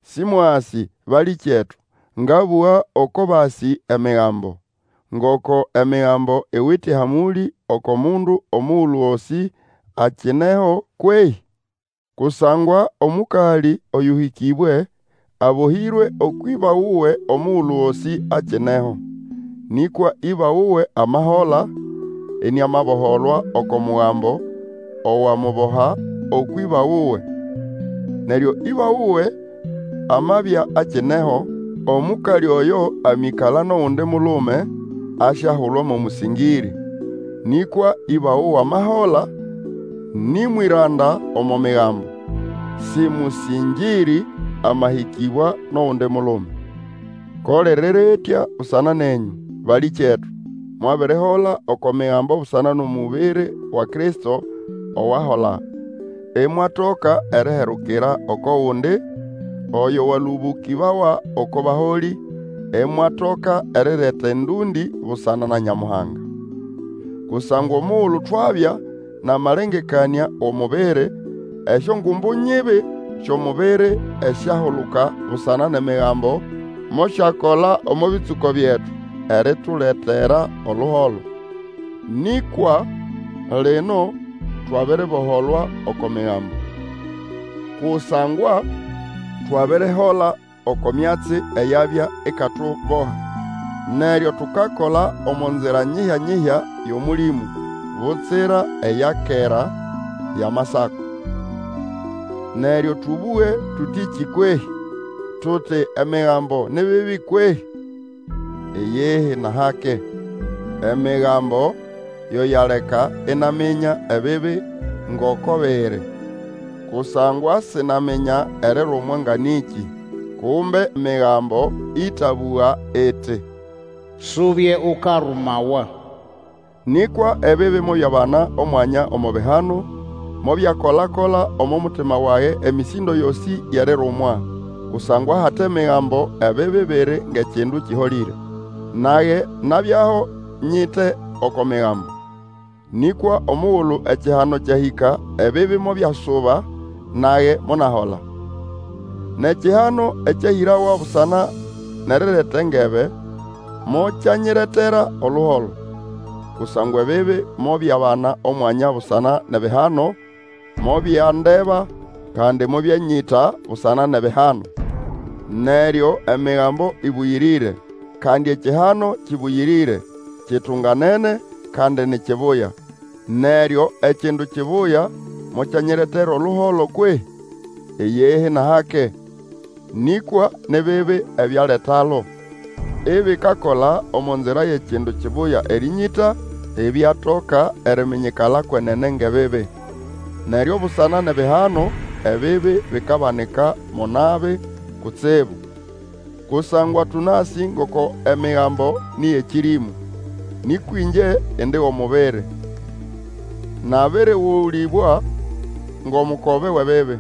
Sĩmwasĩ, balĩkyetu, ngabũga oko basĩ Emigambo, ngoko Emigambo iwite ehamũlĩ oko mundu omugulu gosĩ akineho kwehĩ? Kusangwa omũkalĩ oyũhĩkĩbwe abohĩre ũkwʼĩba wuwe omugulu gosĩ akineho; nĩkwa ĩba wuwe amahola, iniamaboholwa oko mugambo owamuboha ũkwʼĩba wuwe. Neryo ĩba wuwe amabya akineho, omũkalĩ oyo amĩkala nʼogundi mulume, asyahulwa mo mũsĩngĩrĩ; nĩkwa ĩba wuwe amahola, nĩ mwĩranda omo migambo. Sĩ mũsĩngĩrĩ amahĩkĩbwa nʼogundi mulume. Ko liri ritya busana nenyũ, balĩkyetu, mwabirihola oko Migambo busana nʼomubiri wa Kristo owahola, imwatoka eriherukira oko gundi, oyo walũbũkĩbawa oko baholĩ, imwatoka erireta endũndĩ busana na Nyamuhanga. Kusangwa omugulu twabya nʼamalengekanĩa wʼomubiri, esyongumbu nyibi syʼomubiri esyahuluka busana nʼEmigambo, mosyakola omo bĩtsũko byetu erituletera oluholo. Nĩkwa lino twabiriboholwa oko Migambo, kusangwa twabirihola oko myatsi eyabya ikatuboha. Neryo tukakola omo nzira nyihya-nyihya yʼOmũlĩmũ, butsira eya kera yʼAmasako. Emigambo ni bibi kwehĩ? Neryo tũbũge tũtĩkĩ kwehĩ? Tuti Emigambo ni bibi kwehĩ? Iyihi nʼahake! Emigambo yo yaleka inaminya ebibi ngoko biri. Kusangwa sinaminya erirumwa nga nĩkĩ, kumbe Migambo ĩtabũga iti, Subye ukarumawa. Nĩkwa ebibi mobyabana omwanya omo bihano, mobyakola-kola omo mutima wage emĩsĩndo yosĩ yʼerirumwa; kusangwa ahate Migambo, ebibi biri ngʼekindu kĩholĩre. Nage nabyaho nyite oko Migambo; nĩkwa omugulu ekihano kyahĩka ebibi mobyasuba, nage monahola. Nʼekihano ekyahĩrawa busana nʼerireta engebe, mokyanyiretera oluholo. Kusangwa ebibi mobyabana omwanya busana nʼebihano, mobyandeba, kandi mobyanyĩta busana nʼebihano. Neryo Emigambo ĩbũyĩrĩre, kandi ekihano kĩbũyĩrĩre, kitunganene, kandi ni kibuya. Neryo ekindu kibuya mokyanyiretera oluholo kwehĩ? Iyihi nʼahake. Nĩkwa ni bibi ebyaletalo, ibikakola omo nzira yʼekindu kibuya erĩnyĩta, ibyatoka eriminyikala kwenene ngʼebibi. Neryo busana nʼebihano, ebibi bikabanika mo nabi kutsibu. Kusangwa tũnasĩ ngoko Emigambo nĩ yʼekĩrĩmũ; nĩkwa ĩngye indi wʼomubiri, nabĩrĩgũlĩbwa ngʼomukobe wʼebibi.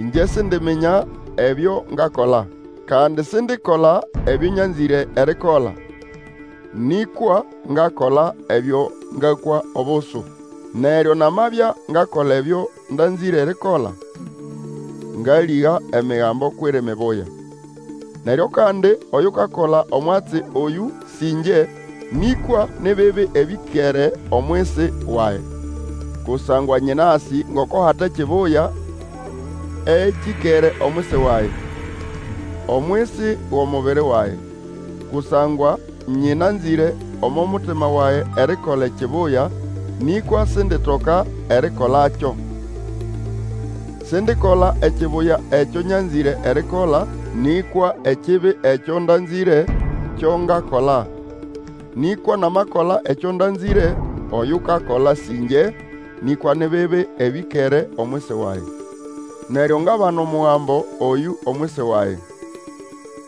Ĩngye sindiminya ebyo ngakola; kandi sindikola ebyo nyanzĩre erikola, nĩkwa ngakola ebyo ngakwa obusu. Neryo namabya ngakola ebyo ndanzĩre erikola, ngalĩga Emigambo kwʼiri mibuya. Neryo kandi oyukakola omwatsi oyũ sĩ ĩngye, nĩkwa ni bibi ebĩkere omwisi wage. Kusangwa nyĩnasĩ ngoko hate kibuya ekĩkere omwisi wage, omwisi wʼomubiri wage; kusangwa nyĩnanzĩre omo mutima wage erikola ekibuya, nĩkwa sinditoka erikolakyo. Sindikola ekibuya ekyo nyanzĩre erikola, nĩkwa ekibi ekyo ndanzĩre kyo ngakola. Nĩkwa namakola ekyo ndanzĩre, oyukakola sĩ ĩngye, nĩkwa ni bibi ebĩkere omwisi wage. Neryo ngabana omugambo oyũ omwisi wage.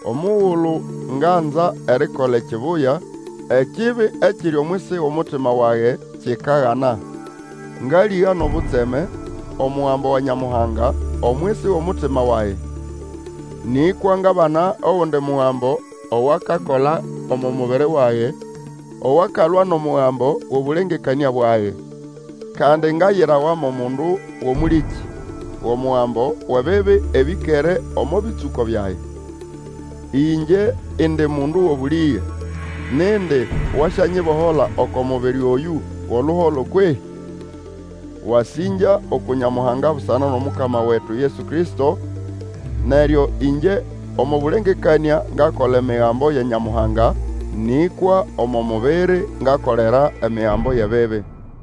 Omugulu nganza erikola ekibuya, ekibi ekiri omwisi wʼomutima wage kikagana. Ngalĩga nʼobutseme, omugambo wa Nyamuhanga omwisi wʼomutima wage. Nĩkwa ngabana ogundi mugambo owakakola omo mubiri wage owakalwa nʼomugambo wʼobũlengekanĩa bwage, kandi ngayirawa mo mundu wʼomũlĩkĩ wʼomugambo wʼebibi ebĩkere omo bĩtsũko byage. Ĩngye indi mundu wʼobũlĩge! Nindi wasyanyibohola oko mubiri oyũ wʼoluholo kwehĩ? Wasĩngya uku Nyamuhanga busana nʼomukama wetu Yesu Kristo. Neryo ĩngye omo bũlengekanĩa ngakola emigambo ya Nyamuhanga, nĩkwa omo mubiri ngakolera emigambo yʼebibi.